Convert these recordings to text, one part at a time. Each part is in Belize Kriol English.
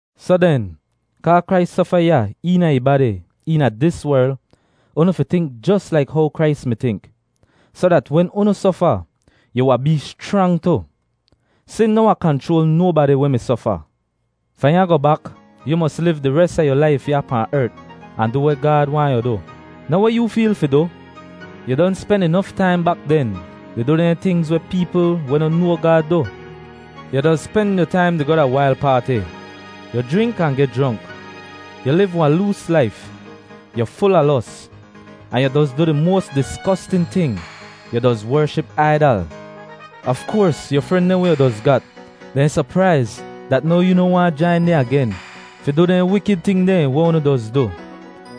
Soh den, kaa Krais sofa ya eena ih badi eena dis werl, unu fi tink jos laik how Krais mi tink, soh dat wen unu sofa, yu wahn bee schrang tu. Sin noh wahn kanchroal nobadi weh mi sofa. Fahn ya goh bak, yu mos liv di res a yu laif ya pahn ert ahn du weh Gaad waahn yu du, noh weh yoo feel fi du. Yu don spen inof taim bak den di du dehn tingz weh peepl weh no noa Gaad du. Yu doz spen yu taim di goh da wail paati; yu jrink ahn geh jronk; yu liv wahn loos laif; yu ful a los; ahn yu doz du di moas disgostin ting, yu doz wership aidal. Af koars yu fren dehn weh yu doz gat, dehn sopraiz dat now yoo noh waahn jain dehn agen fi du dehn wikid ting dehn weh unu doz du,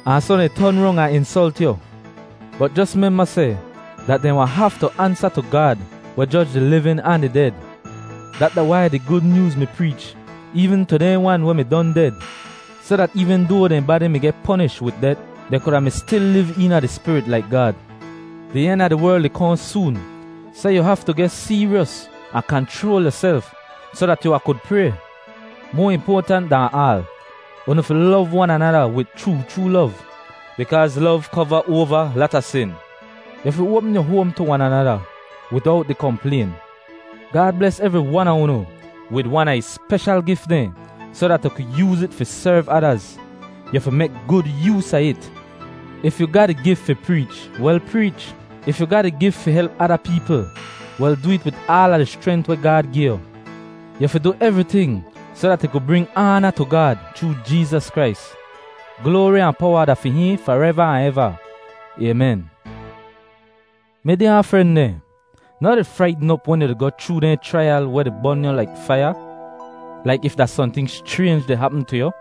ahn soh dehn ton rong ahn insolt yu. Bot jos memba seh dat dehn wahn haftu ansa tu Gaad weh joj di livin ahn di ded. Dat da wai di Gud Nyooz mi preech eevn tu dehn wan weh mi don ded, soh dat eevn doa dehn badi mi geh ponish wid det, dehn kuda mi stil liv eena di spirit laik Gaad. Di en a di werl di kohn soon, soh yu haftu geh seeryos ahn kanchroal yuself soh dat yu wahn kud pray. Moa impoatant dahn aal, unu fi lov wan anada wid chroo chroo lov, bikaaz lov kova oava lata sin. Yu fi oapm yu hoam tu wan anada widowt di komplayn. Gaad bles evri wan a unu wid wan a ih speshal gif dehn soh dat yu ku yooz it fi serv adaz. Yu fi mek gud yoos a it. If yu ga di gif fi preech, wel preech. If yu ga di gif fi help ada peepl, wel du it wid aala di schrent weh Gaad gi yu. Yu fi du evriting soh dat ih ku bring aana tu Gaad chroo Jeezas Krais; gloari ahn powa da fi hihn fareva ahn eva. Aymen. Mi dyaa fren dehn, noh di fraitn op wen yu di goh chroo dehn chraiyal weh bon yu laik faiya, laik if da sohnting schraynj di hapm tu yu.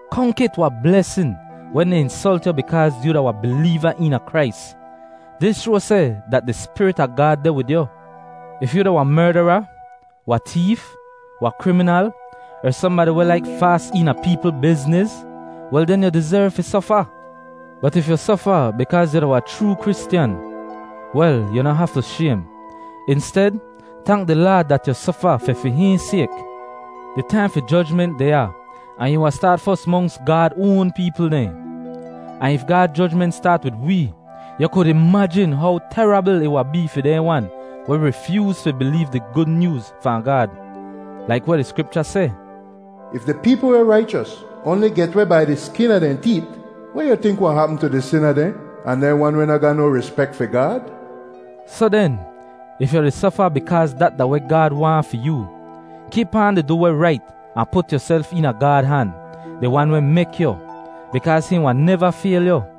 Konk it wahn blesin wen dehn insolt yu bikaaz yu da wahn bileeva eena Krais. Dis shoa seh dat di Spirit a Gaad deh wid yu. If yu da wahn merdara, wahn teef, wahn kriminal, er sohnbadi weh laik faas eena peepl bizniz, wel den yu dizerv fi sofa. Bot if yu sofa bikaaz yu da wahn chroo Kristyan, wel yu noh haftu shaym. Insted, tank di Laad dat yu sofa fi fi hihn sayk. Di taim fi jojment deh ya ahn ih wahn staat fos monks Gaad oan peepl dehn. Ahn if Gaad jojment staat wid wee, yu kud imajin how terabl ih wahn bee fi dehn wan weh rifyooz fi bileev di Gud Nyooz fahn Gaad. Laik weh di Skripcha seh, “If di peepl weh raichos oanli get weh bai di skin a dehn teet, weh yu tink wahn hapm tu di sina dehn ahn dehn wan weh noh ga no rispek fi Gaad?” Soh den, if yu di sofa bikaaz dat da weh Gaad waahn fi yoo, kip aan di du weh rait ahn put yuself eena Gaad han, di Wan weh mek yu, bikaaz hihn wahn neva fayl yu.